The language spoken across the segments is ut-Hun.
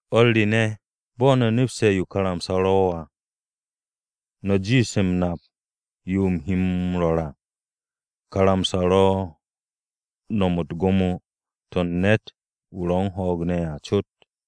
O̱r re ne̱, bo̱ no̱ nepse̱ yo karamsa-o ro̱ à, no̱a jiish m-nap yo u̱m he m-rwo̱r à, karamsa-o ro̱ m-no̱m u̱t-gwo̱mo to̱ u̱n ne̱t-wu̱ ro̱ u̱n ho̱o̱g ne̱ à cot.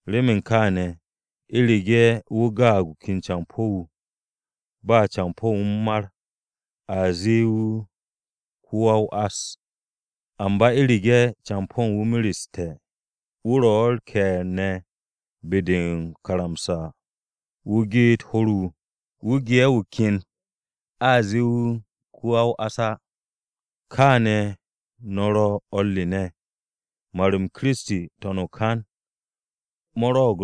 Remen kaane̱, u̱rege̱ wu̱ gaag wu̱ ken campo̱-wu̱, ba campo̱ u̱n wu̱ u̱n mar, a zee wu̱ ko-wa-o-ás. Amba u̱rege̱ campo̱ u̱n wu̱ mereste̱, wu̱ ro̱ u̱r-ke̱e̱r ne̱ be-de o-karamsa ho̱r-wu̱ geet wu̱, wu̱ ken wu̱ ge'e̱ wu̱ a eeg wu̱ “Ko-wa-o-ás” á. Kaane̱ no̱ ro̱ o̱r re ne̱, mar-m Kiristi n-to̱n o-kan mo̱ rwo̱'o̱g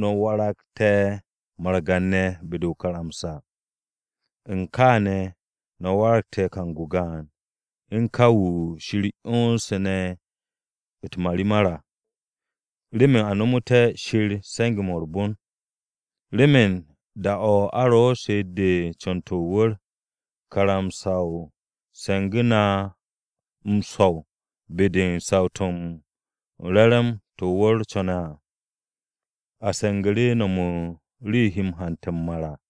no̱ waragte̱ margan-ne̱ be-de o-karamsa. U̱n kaane̱ no̱ waragte̱ kang-o gaan, u̱n ka wu̱ Shir 'yonse̱ ne̱ u̱t-marimar à remen a no̱mo̱té̱ Shir se̱nge̱-mo̱ u̱r-bon. Remen da-o̱ a ro u̱n she'et-de u̱n co̱n-to̱ o-wu̱r, karamsa-o se̱ngu̱ru̱ na u̱t-swo̱w be-de u̱n saw-to̱ u̱n re̱re̱m-mo̱ o-wu̱r co̱ne̱ à, a se̱ngu̱ru̱ no̱m u̱n yo he na hante̱ m-mar à.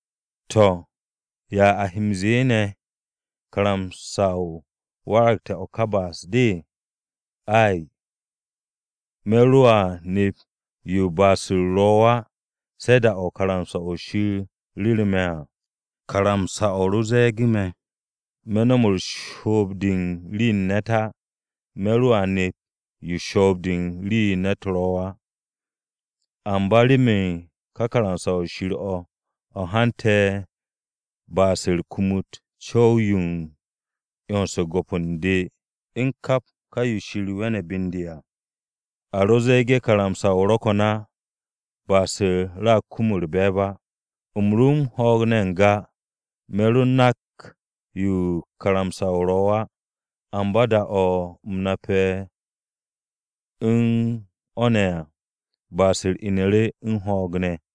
To̱, ¿ya a he m-ze̱e̱ ne̱? ¿Karamsa-o waragte̱ o̱ ka ba'as-de? Ay! Me̱ roa nep yo ba'as-u̱r ro̱ á, se̱ da-o̱ karamsa-o̱ Shir ru̱ru̱ me̱ à. Karamsa-o̱ ro ze̱e̱ge̱ me̱, me̱ no̱m shoob-de u̱n rii-yo u̱n ne̱t á. Me̱ roa nep yo shoob-de u̱n rii-yo u̱n ne̱t ro̱ á. Amba remen ka karamsa-o̱ Shir o̱, o̱ hante̱ ba'as-u̱r kumut o-co̱w yo u̱n 'yons u̱n go̱p u̱n de u̱n kap ka yo Shir we̱ne̱ be u̱n de à! A ro ze̱e̱ge̱ karamsa ro̱ ko̱n á, ba'as-u̱r ro̱a kum u̱r-be̱e̱b á. U̱m ro u̱n ho̱o̱g ne̱ n-ga, me̱ ro nak yo karamsa-o ro̱ á, amba da-o̱ u̱m nape̱ u̱n o̱ ne̱ à, ba'as-u̱r inu̱ru̱ u̱n ho̱o̱g ne̱,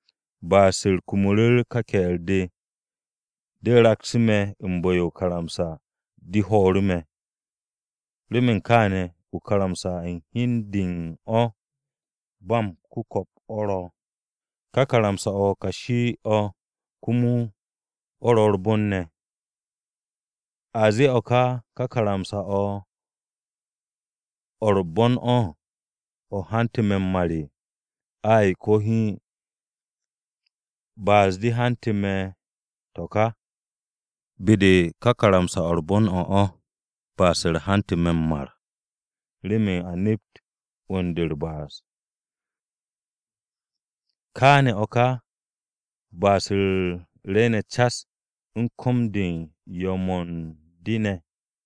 Ba'as-u̱r kumu̱ru̱ ka ke̱e̱r-de, de raksu̱ me̱ u̱n bu̱-yo o-karamsa de ho̱o̱ru̱ me̱. Remen kaane̱, o-karamsa u̱n hi u̱n de u̱n o̱ ba m-ku̱ko̱p o̱ ro̱, ka karamsa-o̱ kashi-o̱ komo o̱ ro̱ u̱r-bon ne̱. ¿A ze̱e̱ o̱ ká, ka karamsa-o̱, o̱ u̱r-bon o̱, o̱ hantu̱ me̱ m-mar? Ay, ko̱ hiin! Ba'as-de hantu̱ me̱ to̱ ka. Be-de u̱n ka karamsa-o̱ u̱r-bon o̱ ba'as-u̱r hantu̱ me̱ m-mar, remen a nept 'wu̱n-de u̱r-ba'as. Kaane̱ o̱ ka ba'as-u̱r rwu̱u̱ne̱ cas u̱n ko̱m-de u̱n yo̱-mo̱ u̱n de ne̱.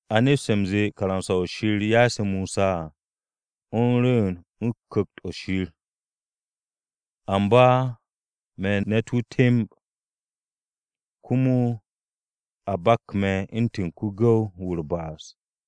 A nepste̱ u̱nze karamsa-o̱ Shir ya'ase̱ Mosa à, o̱ u̱n rwu̱u̱n u̱n Ku̱kt-o̱ Shir. Amba me̱ ne̱t-wu̱ temb, komo a bak me̱ u̱ntu̱n ko-gu̱w-wu̱ u̱r-ba'as.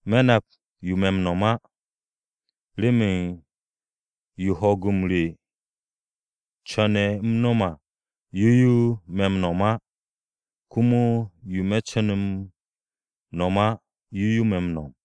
Me̱ nap yo me̱ m-no̱m á, remen yo ho̱o̱g-m re co̱ne̱ u̱m no̱m à, yo yo me̱ m-no̱m á. Komo yo me̱ co̱ne̱ u̱m no̱m á, yo me̱ m-no̱m.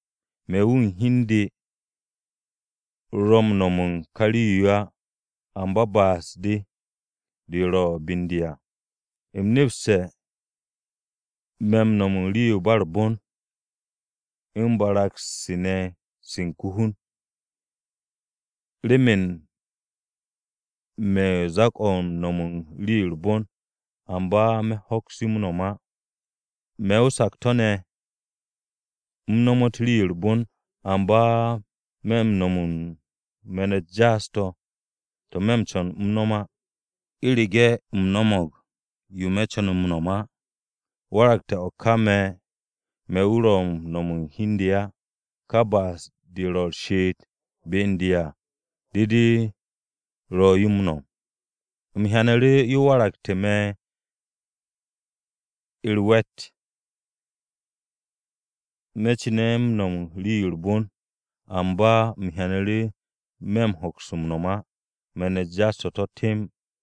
Me̱ wu̱ u̱n hi u̱n de ro̱ u̱n no̱m u̱n ka rii-yo á, amba ba'as-de, de ro̱ be u̱n de à. U̱m nepste̱, me̱ m-no̱m u̱n rii-yo u̱r-bon á, u̱n barag-u̱s re se u̱n ko-hun. Remen me̱ u̱n zak-o̱ u̱n no̱m u̱n rii-yo u̱r-bon, amba me̱ hoks yo m-no̱m á. Me̱ o-sakto̱ ne̱ u̱m nomot rii-yo u̱r-bon, amba me̱ m-no̱m u̱n me̱n-u̱t jaas-to̱, to̱ me̱ co̱ne̱ u̱m no̱m á. U̱rege̱ u̱m no̱mo̱g yo me̱ co̱ne̱ m-nom á, waragte̱ o̱ ka me̱ wu̱ ro̱ yo m-no̱m u̱n hi u̱n de á, ka ba'as-de de ro̱ u̱r-she'et be u̱n de à, de de ro̱ yo m-no̱m. U̱m hyanu̱ru̱ yo waragte̱ me̱ u̱r-we̱t me̱ cu̱ne̱ m-no̱m u̱n rii-yo u̱r-bon, amba u̱m hyanu̱ru̱ yo me̱ hoks m-no̱m à me̱n-u̱t jaas-to̱ to̱ temb.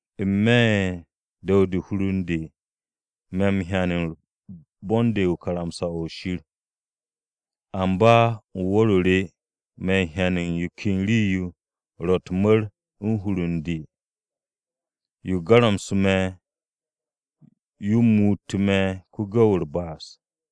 N-me̱ u̱n du̱w-de u̱n hur u̱n de me̱ m-hyan u̱n bon-de u̱n karamsa-o̱ Shir. Amba u̱n wu̱r-o re me̱ m-hyan u̱n yo ken rii-yo ro̱ u̱t-mu̱r u̱n hur u̱n de. Yo garamsu̱te̱ me̱, yo muutu̱ me̱ ko-gu̱w-wu̱ u̱r-ba'as.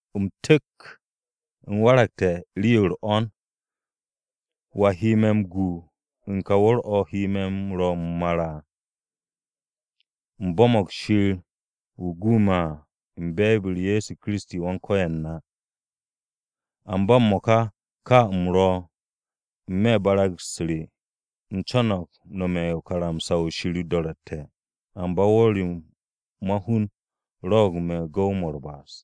U̱m tu̱k! U̱m waragte̱ rii-yo u̱r-'wo̱n! ¿Wa he me̱ m-gu u̱n ka wu̱r-o̱ he me̱ rwo̱ m-mar à? U̱m bo̱mo̱g Shir wu̱ gu me̱ à u̱n be̱e̱b-u̱r Ye̱so Kiristi Wan-Ko̱yan na! Amba m-mo̱ka ka u̱m ro̱, n-me̱ barag-u̱s re u̱m co̱no̱g m-nome̱ karamsa-o̱ Shir o-do̱ro̱tte̱, amba wu̱r-o̱ ma-hun rwo̱'o̱g me̱ gu̱w-mo̱ u̱r-ba'as.